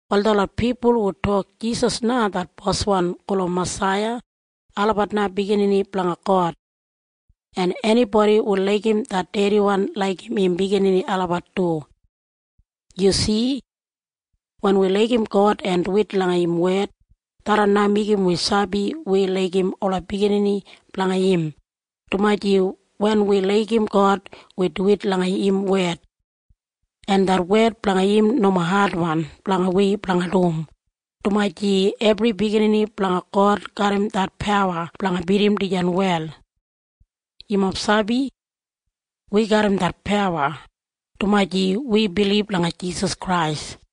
Wal detlot pipul hu tok Jisas na det Boswan gulum Masaiya, olabat na biginini blanga God. En enibodi hu laigim det dediwan laigim im biginini olabat du. Yu si? Wen wi laigim God en duwit langa im wed, tharran na meigim wi sabi wi laigim ola biginini blanga im, dumaji wen wi laigim God, wi duwit langa im wed. En det wed blanga im nomo adwan blanga wi blanga dum, dumaji ebri biginini blanga God garram det pawa blanga bidim dijan wel. Yumob sabi? Wi garram det pawa, dumaji wi bilib langa Jisas Krais.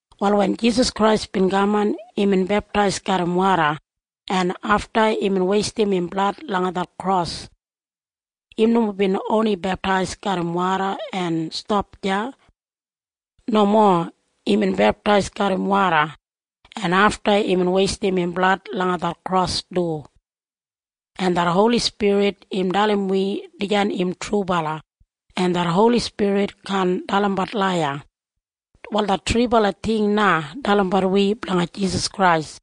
Wal wen Jisas Krais bin kaman, imbin beptais garram woda, en afta imbin weistim im blad langa det kros. Im nomo bin oni beptais garram woda en stap deya. Nomo. Imbin beptais garram woda, en afta imbin weistim im blad langa det kros du. En det Holi Spirit im dalim wi dijan im trubala, en det Holi Spirit kaan dalimbat laiya. Wal det thribala ting na dalimbat wi blanga Jisas Krais.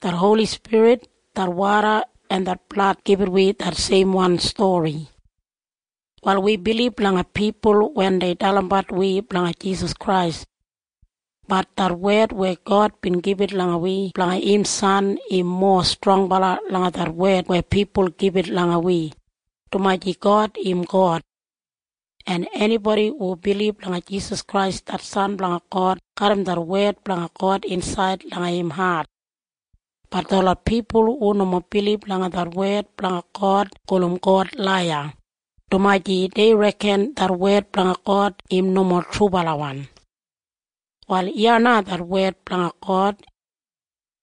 Det Holi Spirit, det woda en det blad gibit wi det seimwan stori. Wal wi bilib langa pipul wen dei dalimbat wi blanga Jisas Krais. Bat det wed weya God bin gibit langa wi blanga im San im mowa strongbala langa det wed weya pipul gibit langa wi, dumaji God im God. En enibodi hu bilib langa Jisas Krais det San blanga God garram det wed blanga God insaid langa im hat. Bat detlot pipul hu nomo bilib langa det wed blanga God gulum God laiya, dumaji dei reken det wed blanga God im nomo trubalawan. Wal iya na det wed blanga God.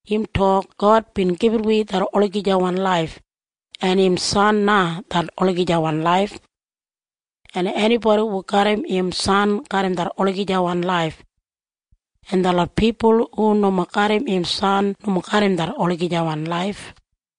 Im tok God bin gibit wi det olagijawan laif, en im San na det olagijawan laif. En enibodi hu garram im San garram det olagijawan laif. En detlot pipul hu nomo garram im San nomo garram det olagijawan laif.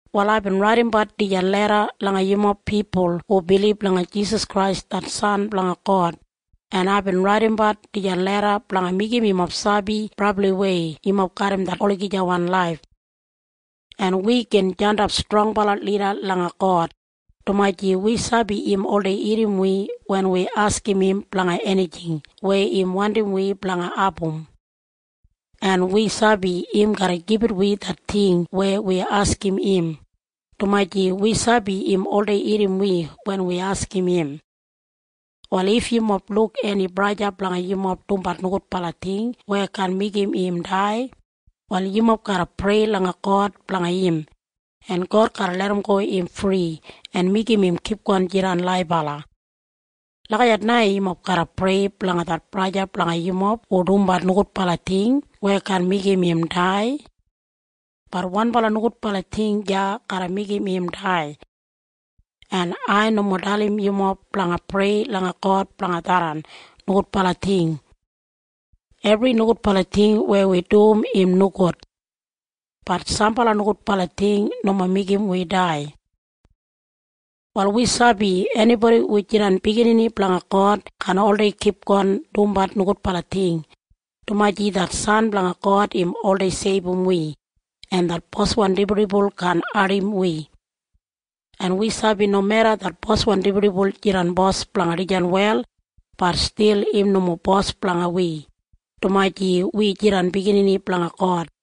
Wal aibin raidimbat dijan leda langa yumob pipul hu bilib langa Jisas Krais det San blanga God, en aibin raidimbat dijan leda blanga meigim yumob sabi brabliwei yumob garram det olagijawan laif. En wi gin jandap strongbala lida langa God, dumaji wi sabi im oldei irrim wi wen wi askim im blanga enijing weya im wandim wi blanga abum. En wi sabi im garra gibit wi det ting weya wi askim im, dumaji wi sabi im oldei irrim wi wen wi askim im. Wal if yumob luk eni braja o sista blanga yumob dumbat nogudbala ting weya kaan meigim im dai, wal yumob garra prei langa God blanga im, en God garra larramgo im fri en meigim im kipgon jidan laibala. Lagijat na yumob garra prei blanga det braja o sista blanga yumob hu dumbat nogudbala ting weya kaan meigim im dai. Bat wanbala nogudbala ting deya garra meigim im dai. En ai nomo dalim yumob blanga prei langa God blanga tharran nogudbala ting. Ebri nogudbala ting weya wi dum im nogud. Bat sambala nogudbala ting nomo meigim wi dai. Wal wi sabi enibodi hu jidan biginini blanga God kaan oldei kipgon dumbat nogudbala ting, dumaji det San blanga God im oldei seibum wi, en det boswan dibuldibul kaan ardim wi. En wi sabi nomeda det boswan dibuldibul jidan bos blanga dijan wel, bat stil im nomo bos blanga wi, dumaji wi jidan biginini blanga God.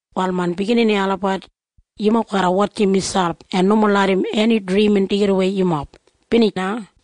Wal main biginini olabat, yumob garra wotjim miselp en nomo larram eni drimin deigidawei yumob. Binij na.